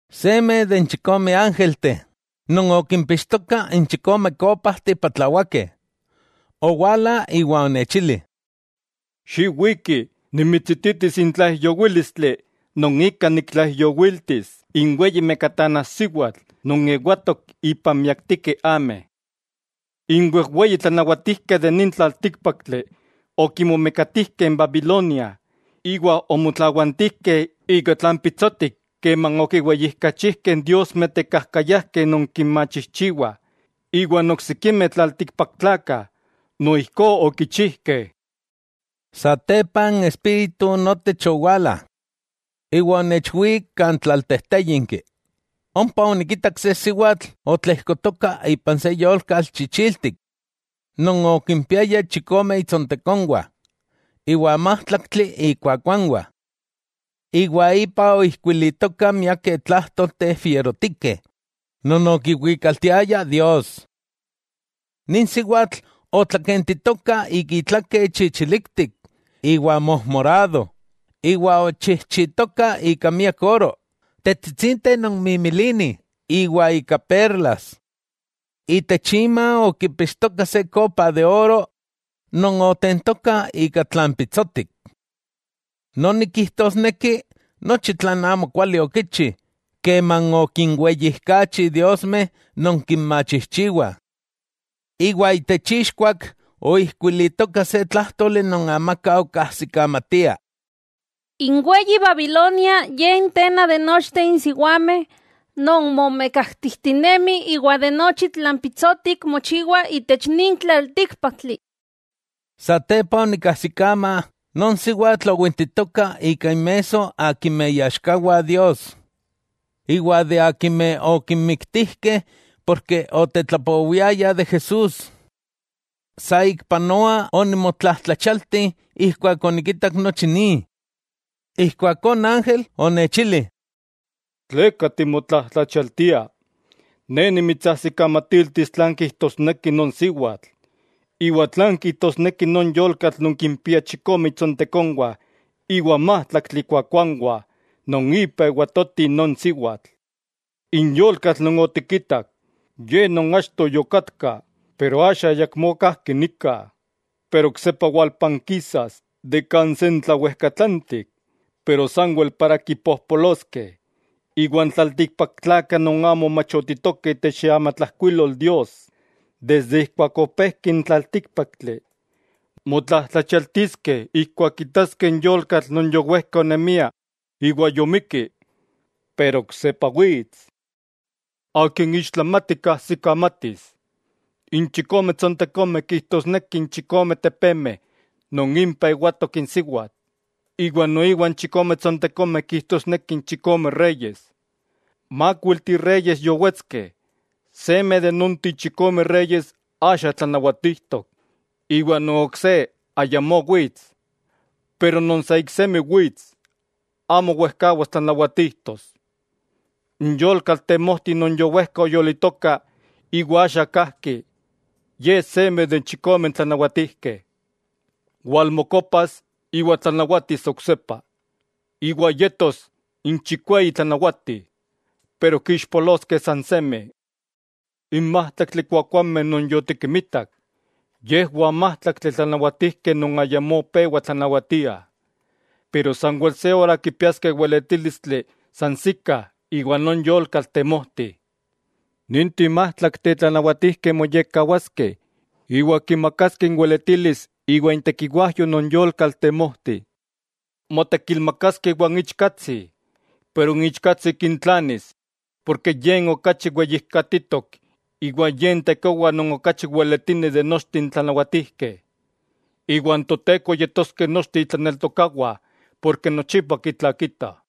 Seme de n chikome ángelteh non okimpixtokah n chikome kópajteh patlawakeh, owala iwa onechili: —¡Xiwiki, nimitsititis n tlaijyowílistli non ika niktlaijyowiltis n weyi mekatanajsiwatl non ewatok ipan miaktikeh ameh! N wejweyi tlanawatijkeh itech nin tlaltíkpaktli, okimomekatijkeh n Babilonia, iwa omotlawantijkeh ika tlan pitsotik keman okinweyijkachijkeh diosmeh tekajkayajkeh non kinmachijchiwah, iwa n oksikimeh tlaltikpaktlakah noijkó okichijkeh. Satepa n Espíritu notech owala, iwa onechwik kan tlaltejtéyinki. Ompa onikitak se siwatl otlejkotoka ipan se yolkatl chichiltik non okimpiaya chikome itsontekonwah iwa májtlaktli ikuakuanwah. Iwa ipa oijkuilitokah miakeh tlájtolteh fierotikeh non okiwikaltiaya Dios. Nin siwatl otlakentitoka ika itlake chichiliktik iwa mojmorado, iwa ochijchitoka ika miak oro, tetsitsinteh non mimilinih iwa ika perlas. Itech ima okipixtoka se kopa de oro non otentoka ika tlan pitsotik. Noni kijtosneki nochi tlan amokuali okichi keman okinweyijkachi diosmeh non kinmachijchiwah. Iwa itech ixkuak oijkuilitoka se tlájtoli non amaka okajsikamatia: “N weyi Babilonia ye n tena de nochteh n siwameh non momekatijtinemih iwa nochi tlan pitsotik mochiwa itech nin tlaltíkpaktli.” Satepa onikajsikama non siwatl owintitoka ika inmesso akimeh iaxkawah Dios, iwa akimeh okinmiktijkeh ken otetlapowiayah de Jesús. Saikpanoa onimotlajtlachialti ijkuak onikitak nochi ni. Ijkuakó n ángel onechili: —¿Tleka timotlajtlachialtia? Ne nimitsajsikamatiltis tlan kijtosneki non siwatl, iwa tlan kijtosneki non yolkatl non kimpia chikome itsontekonwah iwa májtlaktli ikuakuanwah non ipa ewatoti non siwatl. N yolkatl non otikitak, ye achto yokatka, axa ayakmó onka. Pero oksepa walpankisas de kan sentlawejkatlantik, iwa yas milaktik kan kipojpoloskeh. N tlaltikpaktlakah non amo machotitokeh itech iamatlajkuilol Dios, desde ijkuak opejki n tlaltíkpaktli, motlajtlachialtiskeh ijkuak kitaskeh n yolkatl non yowejka onemia iwa yomikki, iwa oksepa wits. 'Akin ixtlamati, kajsikamatis: N chikome tsontekomeh kijtosneki n chikome tepemeh non impah ewatok n siwatl, noiwa n chikome tsontekomeh kijtosneki chikome reyes. Mákuilteh reyes yowetskeh, seme de nonteh chikome reyes axa tlanawatijtok iwa non ok se ayamó wits. Pero non sa iksemi wits, amo wejkawas tlanawatijtos. N yolkatl temojti non yowejka oyolitoka iwa axa kajki, ye seme de n chikomeh tlanawatijkeh. Walmokopas iwa tlanawatis oksepa, iwa yetos n chikweyi tlanawati, pero kixpoloskeh sansemi. 'N májtlaktli kuakuajmeh non yotikinmitak, yejwah májtlaktli tlanawatijkeh non ayamó pewa tlanawatiah. Pero sanwel se ora kipiaskeh weletílistli sansikah iwan non yolkatl temojti. Ninteh májtlakteh tlanawatijkeh moyekkawaskeh iwa kimakaskeh inweletilis iwa intekiwajyo non yolkatl temojti. Motekilmakaskeh iwan Ichkatsi, pero n Ichkatsi kintlanis. N Ichkatsi kintlanis porke Ye n okachi Weyijkatitok iwa Ye n tekowa non okachi Weletini de nochteh n tlanawatijkeh. Iwan Toteko yetoskeh nochteh itlaneltokawah porke nochipa kitlakita.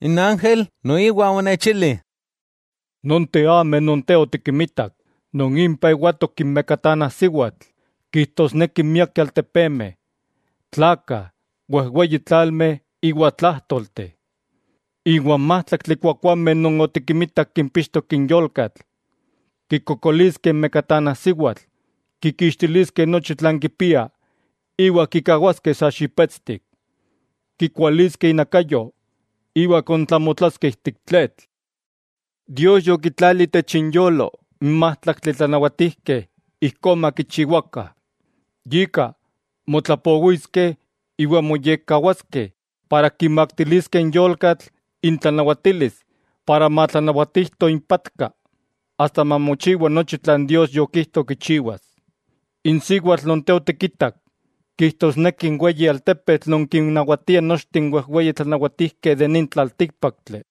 N ángel noiwa onechili: —Nonteh ameh non te otikimitak, non impah ewatok n mekatanajsiwatl, kijtosnekih miakeh altepemeh, tlakah, wejweyi tlalmeh iwa tlájtolteh. 'Iwa n májtlaktli kuakuajmeh non otikimitak kimpixtok n yolkatl, kikokoliskeh n mekatanajsiwatl, kikixtiliskeh nochi tlan kipia iwa kikawaskeh sa xipetstik. Kikualiskeh inakayo iwa kontlamotlaskeh ijtik tletl. 'Dios yokitlali itech inyolo n májtlaktli tlanawatijkeh ijkó makichiwakah. Yika, motlapowiskeh iwa moyekkawaskeh ken kimaktiliskeh n yolkatl intlanawatilis iwa matlanawatijto impatka, asta mamochiwa nochi tlan Dios yokijto kichiwas. N siwatl non te otikitak kijtosneki n weyi altepetl non kinnawatia nochteh n wejweyi tlanawatijkeh itech nin tlaltíkpaktli.